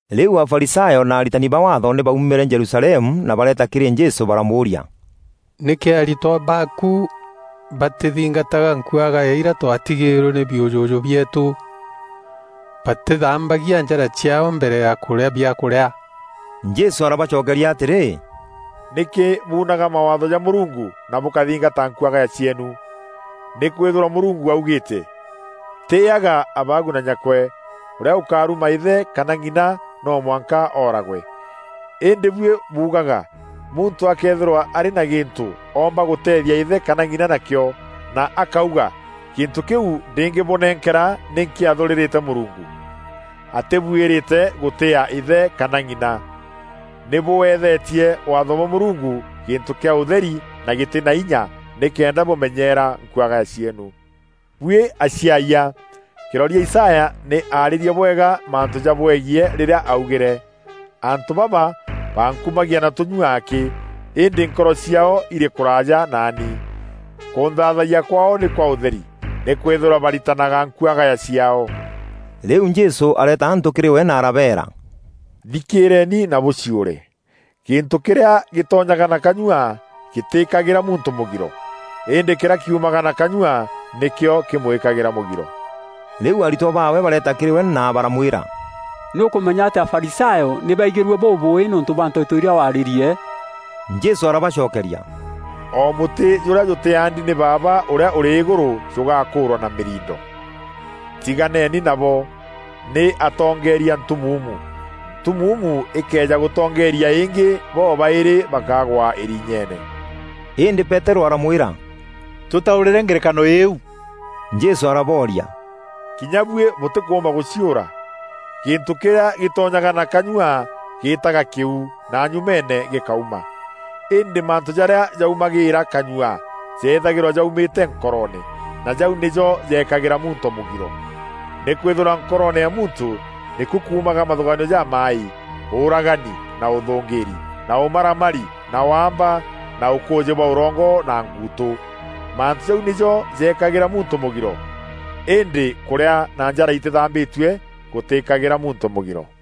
Rîu Afarisayo na aritani ba Waatho nî baaumîre Jerusalemu na bareeta kîrî Jesû baramûûria, “Nîkî aritwa baaku batîthingataga nkuagaya irîa twatigîîrwe nî biûjûjû bieetû? Batîthambagia njara ciaao mbere ya kûrîa biakûrîa!” Jesû arabacokeria atîrî, “Nîkî buunaga Mawaatho ja Mûrungu na bûkathingata nkuagaya cieenu? Nîkwîthîrwa Mûrungu augîîte: ‘Tîîyaga abaagu na nyakwe.’ ‘Ûrîa ûkaruma îthe kana ng'ina no mwanka ooragwe.’ Îndî buî buugaga, muntû akëethîrwa arî na gîntû oomba gûteethia îthe kana ng'ina nakîo, na akauga ‘Gîntû kîu ndîngî bûnenkera nî nkîathûûrîrîte Mûrungu,’ atîbûîrîte gûtîîa îthe kana ng'ina. Nî bûethetie Waatho bwa Mûrungu gîntû kîa ûtheri na gîtî na inya nîkenda bûmenyeera nkuagaya cieenu. Buî aciayia! Kîroria Isaya nî aarîrie bwega mantû jabwegiî rîrîa augîre: ‘Antû baba, bankumagia na tûnyûa akî, îndî nkoro ciaao îrî kûraaja naani. Kûnthaathayia kwaao nî kwa ûtheri, nîkwîthîrwa baritanaga nkuagaya ciaao.’” Rîu Jesû areeta antû kîrî we na arabeera, “Thikîîreeni na bûciûre! Gîntû kîrîa gîtonyaga na kanyua gîtîîkagîra muntû mûgiro, îndî kîrîa kiumaga na kanyua nîkîo kîmwîkagîra mûgiro.” Rîu aritwa baawe bareeta kîrî we na baramwîra, “Nî ûkûmenya atî Afarisayo nî baigîrue bûbûûî nîûntû bwa nteto irîa warîrie?” Jesû arabacokeria, “O mûtî jûrîa jûtîaandi nî Baaba ûrîa ûrî îgûrû jûgakûûrwa na mîriindo. Tiganeni nabo! Nî atongeeria ntumuumu. Ntumuumu îkëeja gûtongeeria îngî bobaîrî bakagwa îrinyeene.” Îndî Peterû aramwîra, “Tûtaûrîre ngerekano îîu.” Jesû arabooria, “Kinya buî bûtîkûûmba gûciûra? Gîntû kîrîa gîtonyaga na kanyua gîîtaga kîuu na nyumeene gîkauma. Îndî mantû jarîa jaumagîîra kanyua jeethagîrwa jaumîte nkoroone, na jau nîjo jeekagîra muntû mûgiro. Nîkwîthîrwa nkoroone ya muntû, nîku kuumaga mathûgaanio jamaaî: ûûragani na ûthûngîîri, na ûmaramari, na waamba, na ûkûûjî bwa ûrongo na nguutû. Mantû jau nîjo jeekagîra muntû mûgiro. Îndî kûrîa na njara itîthambîtue gûtîîkagîra muntû mûgiro.”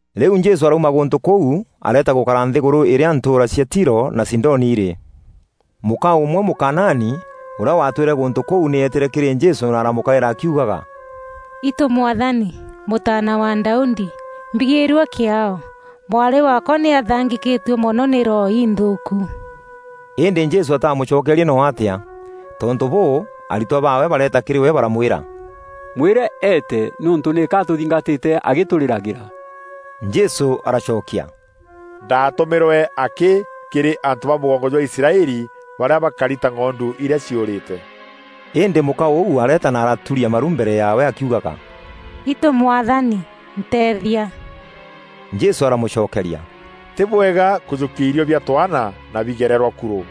Rîu Jesû arauma gûntû kûu areeta gûkara nthîgûrû îrîa ntûûra cia Tiro na Sidoni irî. Mûka ûmwe Mûkanaani ûrîa waatwîre gûntû kûu nî eetîre kîrî Jesû na aramûkaîra akiugaga, “Itû Mwathani, Mûtaana wa Daudi, mbigîîrua kîaao! Mwarî waakwa nî athaangîkîtue mono nî roho inthûûku.” Îndî Jesû ataamûcokerie noo atîa. Tontû bûû, aritwa baawe bareeta kîrî we baramwîra, “Mwîre eete nîûntû nîka atûthingatîte agîtûrîragîra.” Jesû aracokia, “Ndaatûmîrwe akî kîrî antû ba mûgongo jwa Israeli barîa bakari ta ng'ondu irîa ciûrîte.” Îndî mûka ûu areeta na araturia maru mbere yaawe akiugaga, “Itû Mwathani nteethia.” Jesû aramûcokeria, “Tî bwega kûjûkia irîo bia twaana na bigererwa kurû.”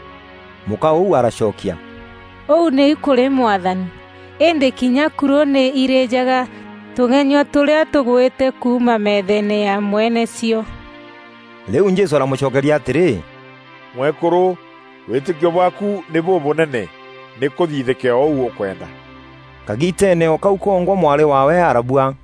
Mûka ûu aracokia, “Ûu nîu kûrî Mwathani. Îndî kinya kurû nî irîîjaga tûng'enyua tûrîa tûgwîte kuuma metheene ya mweene cio.” Rîu Jesû aramûcokeria atîrî, “Mwekûrû, wîtîkio bwaaku nî bûbûnene! Nî kûthithîke o ûu ûkwenda.” Kagiiteene o kau kongwa mwarî waawe arabua.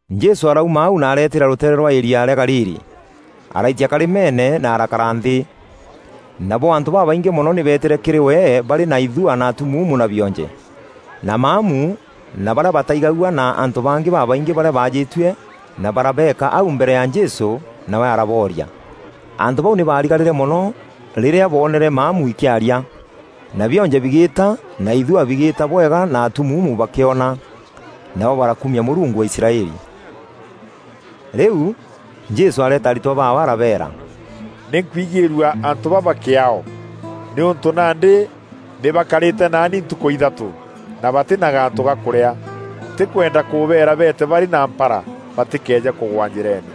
Jesû arauma au na areetîîra rûteere rwa irîa rîa Galili. Araitia karîmeene na arakara nthî. Nabo antû babaingî mono nî beetîre kîrî we barî na ithua na atumuumu na bionje, na maamu na barîa bataigagua na antû bangî babaingî barîa baajîtue na barabeeka au mbere ya Jesû, nawe arabooria. Antû bau nî baarigarîre mono rîrîa boonere maamu ikîaria, na bionje bigîta na ithua bigîîta bwega na atumuumu bakîona. Nabo barakumia Mûrungu wa Israeli. Rîu, Jesû areeta aritwa baawe arabeera, “Nî nkwigîîrua antû baba kîaao, nîûntû nandî nî bakarîte naani ntukû ithatû, na batî na gantû ga kûrîa. Ntîkwenda kûbeera beete barî na mpara, batîkeeje kûgwa njîreene.”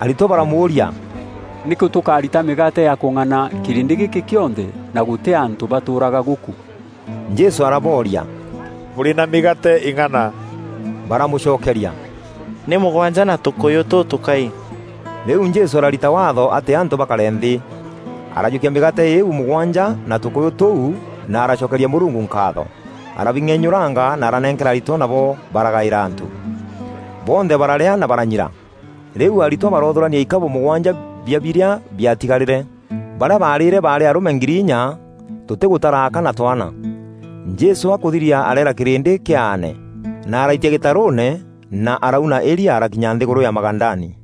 Aritwa baramûûria, “Nîkû tûkarita mîgaate ya kûng'ana kîrîndî gîkî kîonthe na gûtî antû batûûraga gûkû?” Jesû arabooria, “Bûrî na mîgaate îng'ana?” Baramûcokeria, “Nî mûgwanja na tûkûyû tûtûkai.” Rîu Jesû ararita waatho atî antû bakare nthî. Arajûkia mîgaate îîu mûgwanja na tûkûyû tûu na aracokeria Mûrungu nkaatho, arabing'enyûranga na aranenkera aritwa nabo baragaîra antû. Bonthe bararîa na baranyira. Rîu aritwa baroothûrania ikabû mûgwanja bia birîa biatigarîre. Barîa baarîre baarî arûme ngiri inya tûtîgûtara aka na twaana. Jesû akûthiria areera kîrîndî kîaane, na araitia gîtarûûne na arauna îria arakinya nthîgûrû ya Magadani.